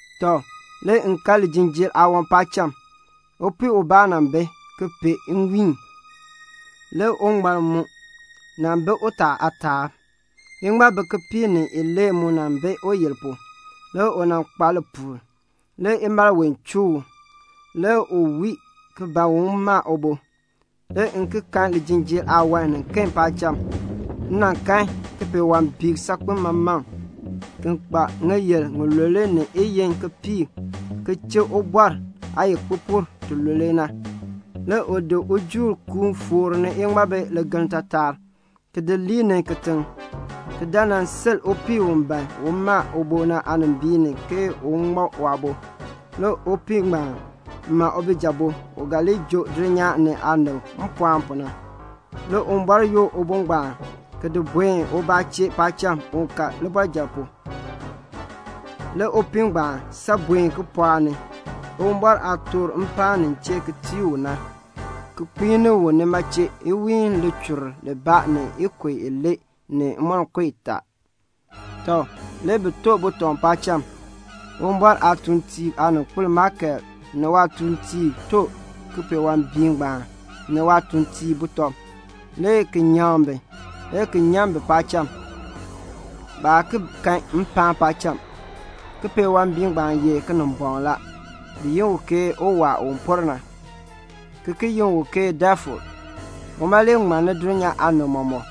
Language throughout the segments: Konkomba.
Tɔ, le m kan lijinjiir aawan paacham. Upii ubaa nan bi ki pee nwiin. Le uŋmal mu nan bi utaa aataab. Iŋmabi kipiik ni ilee mu nan bi uyil pu. Le u nan kpa lipuul. Le imalween chuu u. Le u wii ki ban un ma ubo. Le m ki kan lijinjiir aawan niken paacham. M kan kipeewambiik saakpeŋ maman, u kpa ŋiyil ŋilule ni iyiin kipiik, ki chik ubɔr aayikpupur tilule. Le u di ujuul kuun foor ni iŋmabi ligeln taatar, ki di lii ni kitiŋ, ki dan nan sil upii u ban un ma ubo na aanimbiin ni ke un ŋma waabo. Le upii ngbaan ma ubijabo u ga li joo dulnyaa ni aanib mpɔɔn pu na. Le Uwumbɔr yoor ubo ngbaan ki di buen ubaa chee paacham un ka waabɔrjal pu. Le upii ngbaan san buen kipɔɔk ni, Uwumbɔr aah toor mpaan nin chee ki tii u na, ki kpiini u nima chee iwiin lichur libaa ni ikub ilee ni imonko itaa. Tɔ, le bi to butɔb paacham. Uwumbɔr aatuuntiib aaninkpil Maikel ni waatuuntiib to kipeewambiik ngbaan ni waatuuntiib butɔb, le ki nyaŋ bi, le ki nyan bi paacham. Baa ki kan mpaan paacham. Kipeewambiik ngbaan ye Kinimbɔŋ la. Bi yi u ke Uwaa u por na, ki ki yi u ke Defil. Uma le ŋmanni dulnyaa aanib mɔmɔk.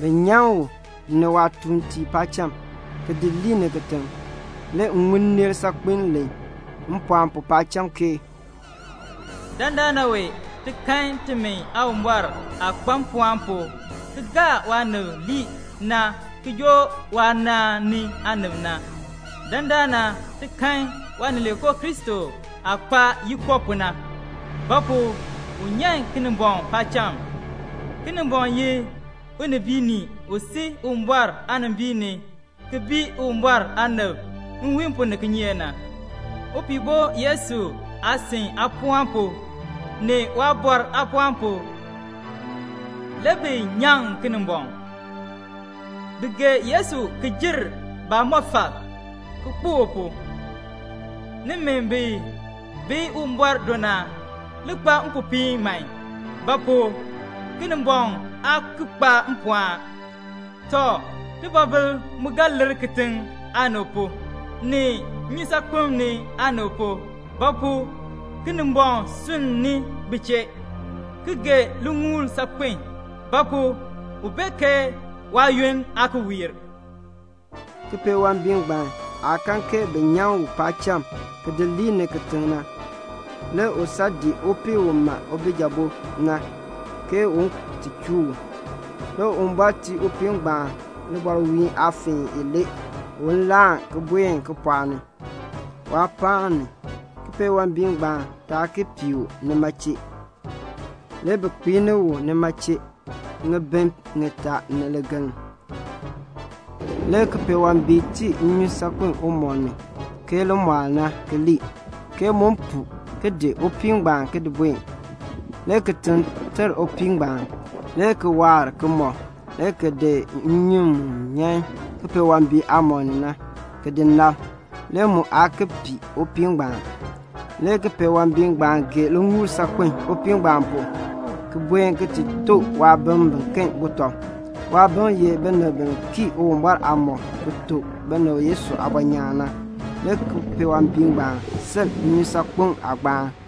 Bi nyan u ni waatuuntiib paacham, ki di lii ni kitiŋ. Le m ŋun nneel saakpiin len mpɔɔn pu paacham ke "Dandana wee ti kan timi Aawumbɔr aah kpa mpɔɔn pu ki gaa waanib lii na ki joo waanaan ni aanib na. Dandana ti kan Waanileekoo Kristo aah kpa yiko pu na. Ba pu? u nyan Kinimbɔŋ paacham. Kinimbɔŋ ye unibiinii u sil Uwumbɔr aanimbiin ni ki bii Uwumbɔr aanib nwiin pu ni kinyeek na. Upihbo Yesu aasin aapɔɔn pu ni waaliin aapɔɔn pu le bi nyaŋ Kinimbɔŋ. Bi gee Yesu ki jer baamɔfal, ki kpo u pu. Nimi bi bi Uwumbɔr do na, li kpa mpopiin man; ba pu? Kinimbɔŋ aa ki kpa mpɔɔn. Tɔ, tibɔbil mu ga lir kitiŋ aanib pu, ni nnyusaakpem aanib pu; ba pu? Kinimbɔŋ sunn ni bi chee, ki gee liŋuul saakpeln; ba pu? u bee ke waayoonn aa ki wiir." Kipeewambiik ngbaan aah kan ke bi nyan u paacham ki lii ni kitiŋ na, le u san dii upii u ma ubijabo na, ke un ti chuu u. Le Uwumbɔr tii upii ngbaan libɔrwiin aafeen ilee un laan ki buen kipɔɔk ni, waapaan ni, kipeewambiik ngbaan taa ki pii u nima chee. Le bi kpiini u nima chee ŋibin ŋitaa ni ligeln. Le kipeewambiik tii nnyun saakpem umɔb ni ke limɔɔl na ki lii, ke mu puu ki di upii ngbaan ki di buen. Le kitiŋ ter upii ngbaan, le ki waar kimɔb le ki di nnyun mu nyan kipeewambiik aamɔb ni na, ki di nab, le mu aa ki pii upii ngbaan. Le kipeewambiik ngbaan gee liŋuul saakpen upii ngbaan pu, ki buen ki ti to waabim biken butɔb. Waabim ye binib bi kii Uwumbɔr aamɔb ki tuk binib Yesu aabɔnyaan na. Le kipeewambiik ngbaan sil nnyusaakpem aagbaan.